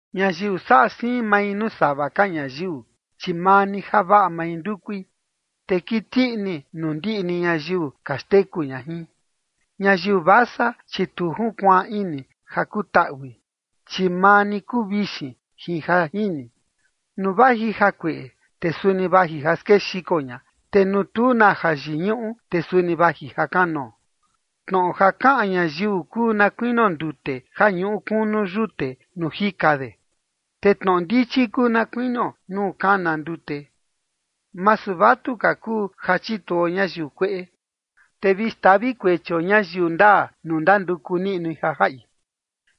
Ñayiu saꞌa siin mai nuu sava ka ñayiu, chi maa ni javaꞌa mai ndukui, te kiti ini nuu ndiꞌi ni ñayiu ka xteku ña jin. Ñayiu vasa, chi tu junkuaan ini ja kutuaꞌi, chi maa ni kuu vixin jin ja jini. Nuu vaji jakueꞌe, te suni vaji ja skexiko ña, te nuu tu na jayiñuꞌu, te suni vaji ja kanoo. Tnoꞌo ja kaꞌan ñayiu kuu na kuinio ndute ja ñuꞌu kunu yute nuu jika de, te tnoꞌo ndichi kuu na kuinio nuu kana ndute. Masu vatuka kuu ja chituo ñayiu kueꞌe, te vi xtavi kuechio ñayiu ndaa nuu ndanduku niꞌnui ja jaꞌi.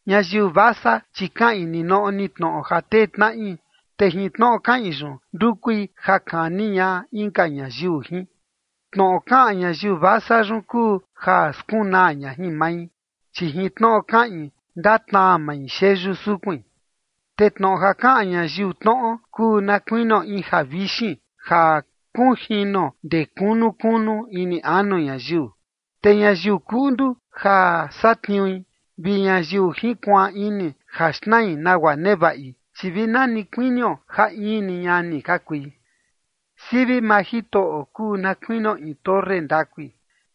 Ñayiu vasa, chi kaꞌin ninoꞌo ni tnoꞌo ja tee tnaꞌi, te jin tnoꞌo kaꞌin yun ndukui ja kani ña inka ñayiu jin. Tnoꞌo kaꞌan ñayiu vasa yun kuu ja skunaa ña jin mai, chi jin tnoꞌo kaꞌin ndatnaa mai xeyu sukuin. Te tnoꞌo ja kaꞌan ñayiu tnoꞌo kuu na kuinio in javixin ja kunjino ndee kunu kunu ini anu ñayiu. Te ñayiu kuꞌndu ja satniui vi ñayiu jinkuaan ini ja xnai nagua nevaꞌi, chi vi na ni kuinio ja in ni ñani ka kui. Sivi maa Jitoꞌo kuu na kuinio in torre ndakui,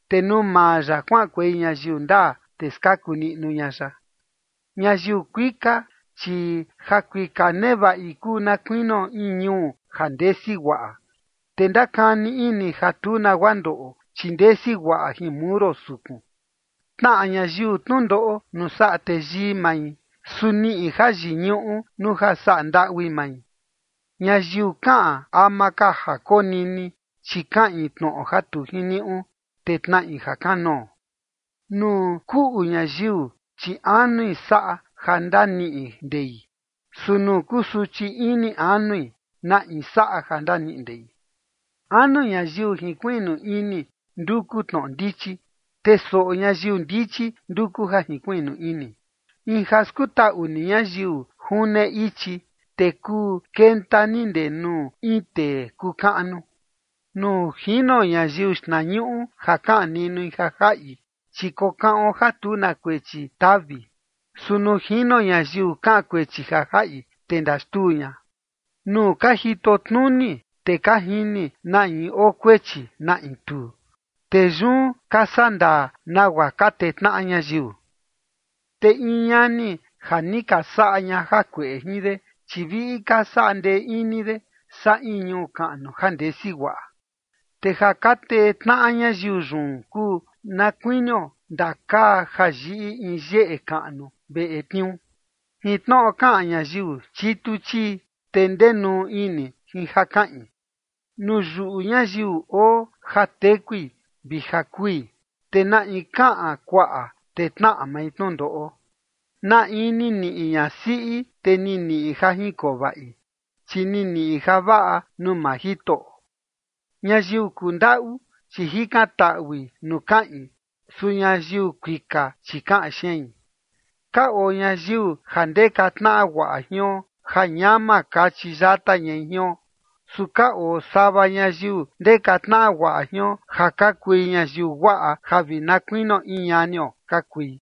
te nuu maa ya kuaꞌankuei ñayiu ndaa, te skaku niꞌnu ña ya. Ñayiu kuika, chi jakuika nevaꞌi kuu na kuinio in ñuu ja ndesi guaꞌa, te ndakani ini ja tu nagua ndoꞌo, chi ndesi guaꞌa jin muro sukun. Tnaꞌa ñayiu tnundoꞌo nuu saꞌa teyii mai. Su niꞌi jayiñuꞌu nuu ja saꞌa ndaꞌui mai. Ñayiu kaꞌan ama ka ja konini, chi kaꞌin tnoꞌo ja tu jiniuꞌu, te tnaꞌi ja kanoo. Nuu kuꞌu ñayiu, chi anui saꞌa ja ndaniꞌi ndei. Su nuu kusuchi ini anui, ¿na in saꞌa ja ndaniꞌi ndei? Anu ñayiu jinkuiꞌnu ini nduku tnoꞌo ndichi, te soꞌo ñayiu ndichi nduku ja jinkuiꞌnu ini. In ja skutaꞌu ni ñayiu june ichi, te kuu kenta ni ndee nuu in tee kuu kaꞌnu. Nuu jino ñayiu xtnañuꞌu ja kaꞌan niꞌnui ja jaꞌi, chi kokaꞌon ja tu na kuechi tavi. Su nuu jino ñayiu kaꞌan kuechi ja jaꞌi, te ndaxtuu ña. Nuu ka jitotnuni, te ka jini na in oo kuechi, na in tuu, te yun ka sandaa nagua ka tee tnaꞌa ñayiu. Te in ñani ja ni ka saꞌa ña jakueꞌe jin de, chi viꞌi ka saꞌa ndee ini de saa in ñuu kaꞌnu ja ndesi guaꞌa. Te ja ka tee tnaꞌa ñayiu yun kuu na kuinio ndakaa ja yiꞌi in yeꞌe kaꞌnu veꞌe tniuu. Jin tnoꞌo kaꞌan ñayiu chitu chii, te ndenuu ini jin ja kaꞌin. Nuu yuꞌu ñayiu oo ja tekui vi ja kui, te na in kaꞌan kuaꞌa, te tnaꞌa mai tnundoꞌo. Na in ni niꞌi ñasiꞌi, te ni niꞌi ja jinkoo vaꞌi, chi ni niꞌi javaꞌa nuu maa Jitoꞌo. Ñayiu kundaꞌu, chi jikantaꞌui nuu kaꞌin. Su ñayiu kuika, chi kaꞌan xein. Ka oo ñayiu ja ndeka tnaꞌa guaꞌa jion ja ñama kachi yata ñai jion. Su ka oo sava ñayiu ndeka tnaꞌa guaꞌa jion ja ka kui ñayiu guaꞌa ja vi na kuinio in ñanio ka kui.